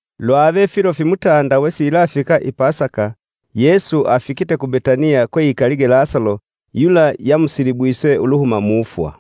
Lwave filo fimutanda wesiyilafika i Pasaka Yesu afikite ku Betaniya kweikalige Lasalo yula yamusilibwise uluhuma mufwa.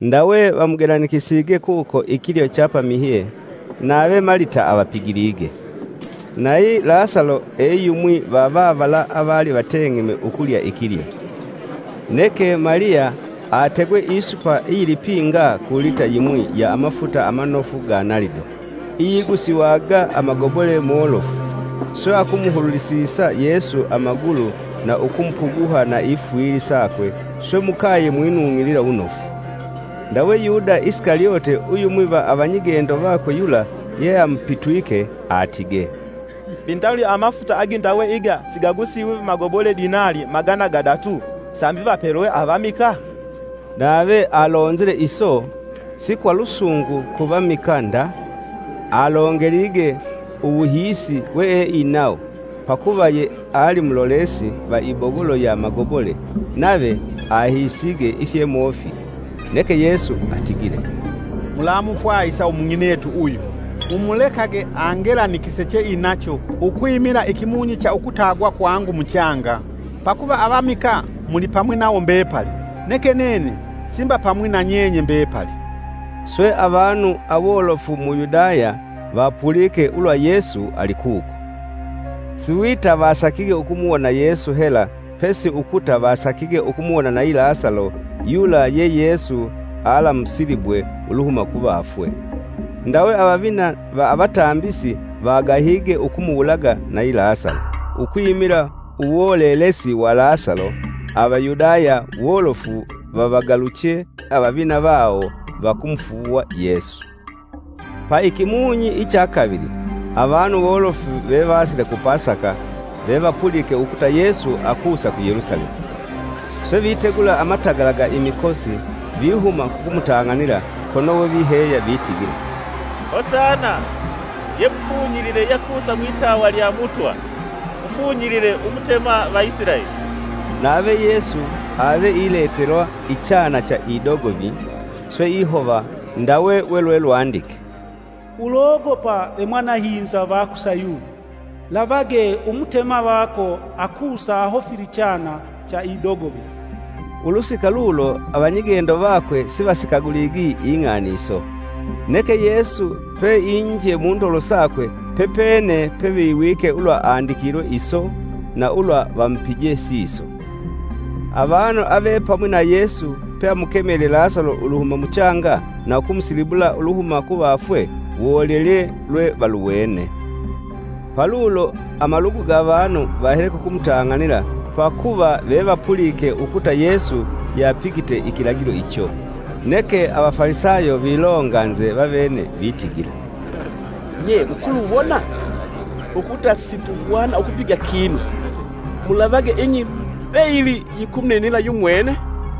Ndawe vamugelanikisige kuko ikilyo cha pamihye nave Malita avapigilige; nayi Lasalo e yumwi va vavala avali vateng'eme Ukulya ikilyo. Neke Maliya ategwe isupa iyilipinga ku lita yimwi ya amafuta amanofu ga nalido iyigusiwaga amagobole molofu, swe akumuhululisisa Yesu amagulu na ukumupuguha na ifwili sakwe swe mukaye mwinung'ilila wunofu. Ndawe Yuda Isikalyote uyumwi va avanyigendo vakwe yula yeamupitwike atige, “Mbi ndawuli amafuta agindawe iga sigagusiswi magobole dinali magana gadatu sambi vapelwe avamikaa?” Nave alonzile iso si kwa lusungu ku vamikaa nda, alongelige uwuhiisi weeinawo pakuva yeali mulolesi va ibogolo ya magobole, nave ahiisige ifyemofili. Neke Yesu atigile, “Mulamufwahisa umung'inetu uyu! Mumulekage angelanikise cheinacho, ukwimila ikimunyi cha ukutagwa kwangu muchanga. Pakuva avamikaa mulipamwi nawo mbepali neke nene simbapamwi na nyenye mbepali.” Swe avanu awolofu mu Yudaya vapulike ulwa Yesu ali kuko. Siwita vasakige ukumuwona Yesu hela pesi ukuta vasakige ukumuwona na yi Lasalo, yula ye Yesu alaamusilibwe uluhuma kuvafwe. Ndawe avavina va avatambisi vagahige ukumuwulaga na yi Lasalo, ukwimila uwolelesi wa Lasalo Avayudaya wolofu vavagaluche vavabesise avavina vawo va kumufuuwa Yesu. Pa ikimunyi icha kavili avanu wolofu vevasile ku Pasaka vevapulike ukuta Yesu akusa ku Yelusalemu. Swe vitegula amatagala ga imikosi vihuma kukumutang'anila kono we viheya vitigila, “Hosana! Ye mufunyilile yakusa mwitawa lya Mutwa, mufunyilile Umutema va Isilaeli.” Nave Yesu ave iletelwa ichana cha idogovi swe ihova ndawe we lwe lwandike. “Ulogopa, ve mwanahinza va ku Sayuni! Lavage, Umutema vako akusa ahofile ichana cha idogovi.” Ulusika lulo, avanyigendo vakwe sivasikaguligi ing'ani iso, neke Yesu peinje mundolo sakwe pepene peviwike ulwa andikilwe iso na ulwa vamupije siso. Avanu avepamwi na Yesu peamukemelye Lasalo uluhuma muchanga na ukumusilibula uluhuma kuvafwe wolelelye lwe valuwene. Palulo amalugu ga vanu vahele kukumutang'anila pakuva ve vapulike ukuta Yesu yapigite ikilagilo icho. Neke Avafalisayo vilonganze vavene vitigila, “Nye mukuluwona? Ukuta situhwana ukupiga kinu! Mulavage ing'i mbeyili yikumuninila yumwene!”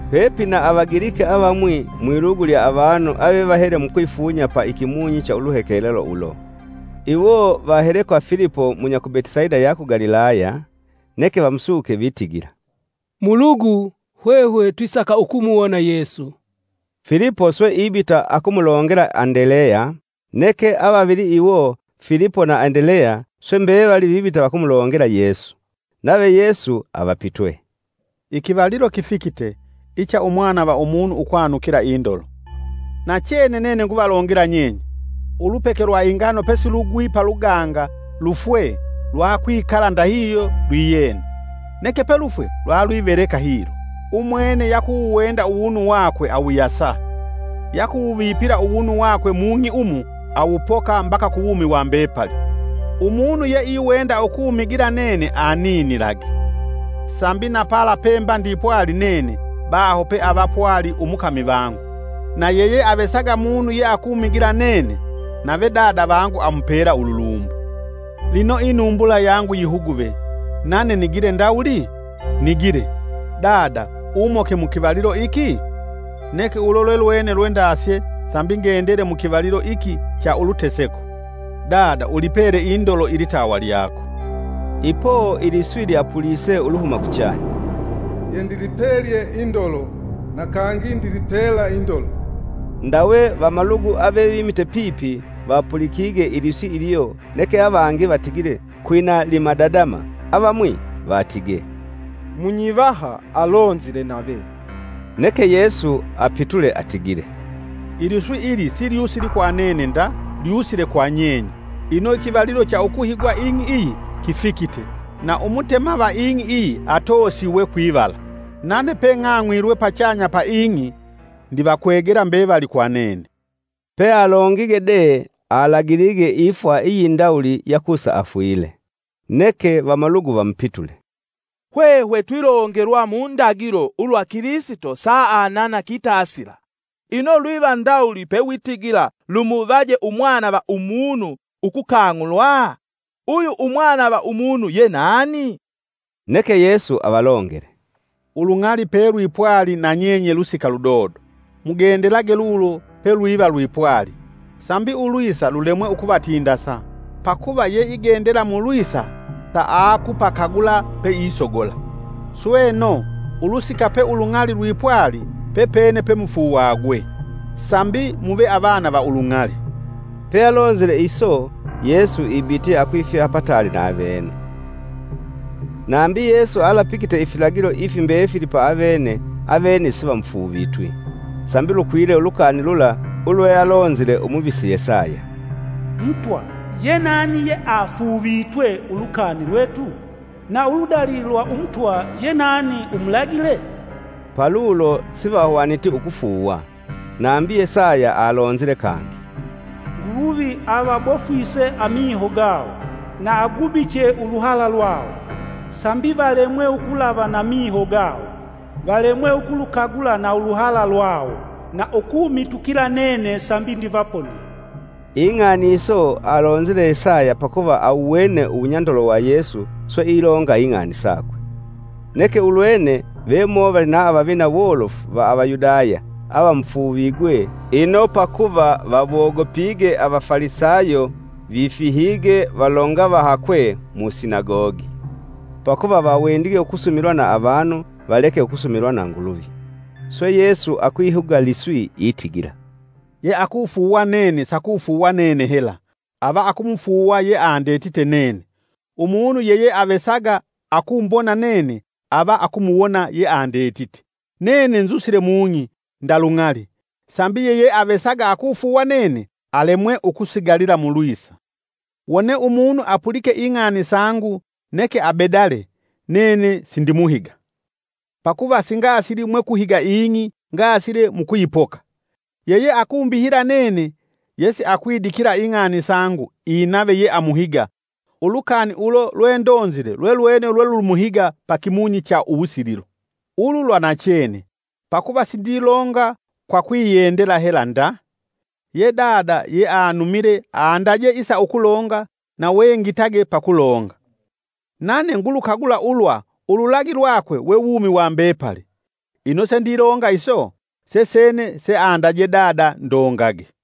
Pepina Avagiliki avamwi mwilugu lya avanu avevahele mukwifunya pa ikimunyi cha uluhekelelo ulo. Iwo vahele kwa Filipo (munya ku Betisaida ya ku Galilaya) neke vamusuke vitigila, “Mulugu, hwehwe twisaka ukumuwona Yesu.” Filipo swe ibita akumulongela Andeleya, neke avavili iwo Filipo na Andeleya, swe mbevali vibita vakumulongela Yesu. Nave Yesu avapitwe, “Ikivalilo kifikite icha Umwana va Umunu ukwanukila indolo! Nachene nene nguvalongela nyenye, ulupeke lwa ingano pesilugwi paluganga lufwe lwakwikala ndahihyo lwiyena, neke pelufwe lwalwiveleka hilo. Umwene yakuwuwenda uwunu wakwe awuyasa, yakuwuvipila uwunu wakwe mung'i umu awupoka mbaka kuwumi wa mbepali. Umunu yeiwenda ukumigila nene aninilage, sambi na pala pemba ndipwali nene, baho peava pwali umukami vangu. Na yeyeavesaga munu yeakunigila nene, nave Dada vangu amupela ululumbo. “Lino inumbula yangu yihuguve nane nigile ndawuli? Nigile: ‘Dada, umoke mu kivalilo iki?’ Neke ulo lwelwene lwendasye sambi ngendele mu kivalilo iki cha uluteseko. Dada ulipele indolo ilitawa lyako.” Ipo iliswi lyapulise uluhuma kuchanya, “Yendilipelye indolo na kangi ndilipela indolo.” Ndawe vamalugu avevimite pipi vapulikige iliswi ilyo neke avangi vatigile kwina limadadama avamwi vatige, “Munyivaha alonzile nave.” Neke Yesu apitule atigile, “Iliswi ili silyusili kwa nene nda, lyusile kwa nyenye. Ino ikivalilo cha ukuhigwa ing'i iyi kifikite, na umutema va ing'i iyi atoosiwe kwivala. Nane peng'ang'wilwe pachanya ya ing'i ndivakwegela mbevali kwa nene.” ( Pealongige de alagilige ifwa iyindawuli yakusa afwile). Neke vamalugu vamupitule, “Hwehwe twilongelwa mu ndagilo ulwa Kilisito saanana kitasila. Ino lwiva ndawuli pewitigila lumuvaje Umwana va Umunu ukukang'ulwa? Uyu Umwana va Umunu ye nani?” Neke Yesu avalongele, “Ulung'ali pelwipwali na nyenye lusika ludodo. Mugendelage lulo pelwiva lwipwali, sambi ulwisa lulemwe ukuvatindasa, pakuva yeigendela mulwisa saakupakagula peisogola. Sweno, ulusika lwe ulung'ali lwipwali pepene pemufuuwagwe; sambi muve avana va ulung'ali.” Pealonzile iso, Yesu ibitye akwifiha pataali na avene. Nambi Yesu alapigite ifilagilo ifi mbefili pa avene, avene sivamufuuvitwi. Sambi lukwile ulukani lula ulwealonzile umuvisi Yesaya: “Mutwa, ye nani yeafuuvitwe ulukani lwetu? Na uludali lwa Umutwa yenani umulagile?” Palulo sivahwaniti ukufuuwa. Nambi Yesaya alonzile kangi, “Nguluvi avabofwise amiho gawo, na agubiche uluhala lwawo; sambi valemwe ukulava, na miho gawo valemwe ukulukagula na uluhala lwawo na ukumitukila nene sambi ndivaponie.” Ing'ani iso alonzile Yesaya pakuva awuwene uwunyandolo wa Yesu swe ilonga ing'ani sakwe. Neke ulwene, vemovali na avavina wolofu va Avayudaya avamufuuvigwe ino pakuva vawogopige Avafalisayo vifihige valonga vahakwe musinagogi. Pakuva vawendige ukusumilwa na avanu valeke ukusumilwa na Nguluvi. Swe Yesu akwihuga liswi itigila, “Yeakufuuwa nene sakufuuwa nene hela, ava akumufuuwa yeandetite nene. Umunu yeyeavesaga akumbona nene ava akumuwona yeandetite. Nene nzusile mung'i nda lung'ali, sambi yeyeavesaga akufuuwa nene alemwe ukusigalila mulwisa. Wone umunu apulike ing'ani sangu neke abedale nene sindimuhiga. Pakuva singasili mwe kuhiga ing'i ngasile mukuyipoka. Yeyeakumbihila nene yesiakwidikila ing'ani sangu inave yeamuhiga, ulukani ulo lwendonzile lwelwene lwelumuhiga pa kimunyi cha uwusililo. Ulu lwa nachene, pakuva sindilonga kwa kwiyendela hela nda, ye Dada yeanumile andaje isa ukulonga na wengitage pakulonga. Nane ngulukagula ulwa ululagi lwakwe we wumi wa mbepali. Ino sendilonga iso, sesene seandaje Dada ndongage.”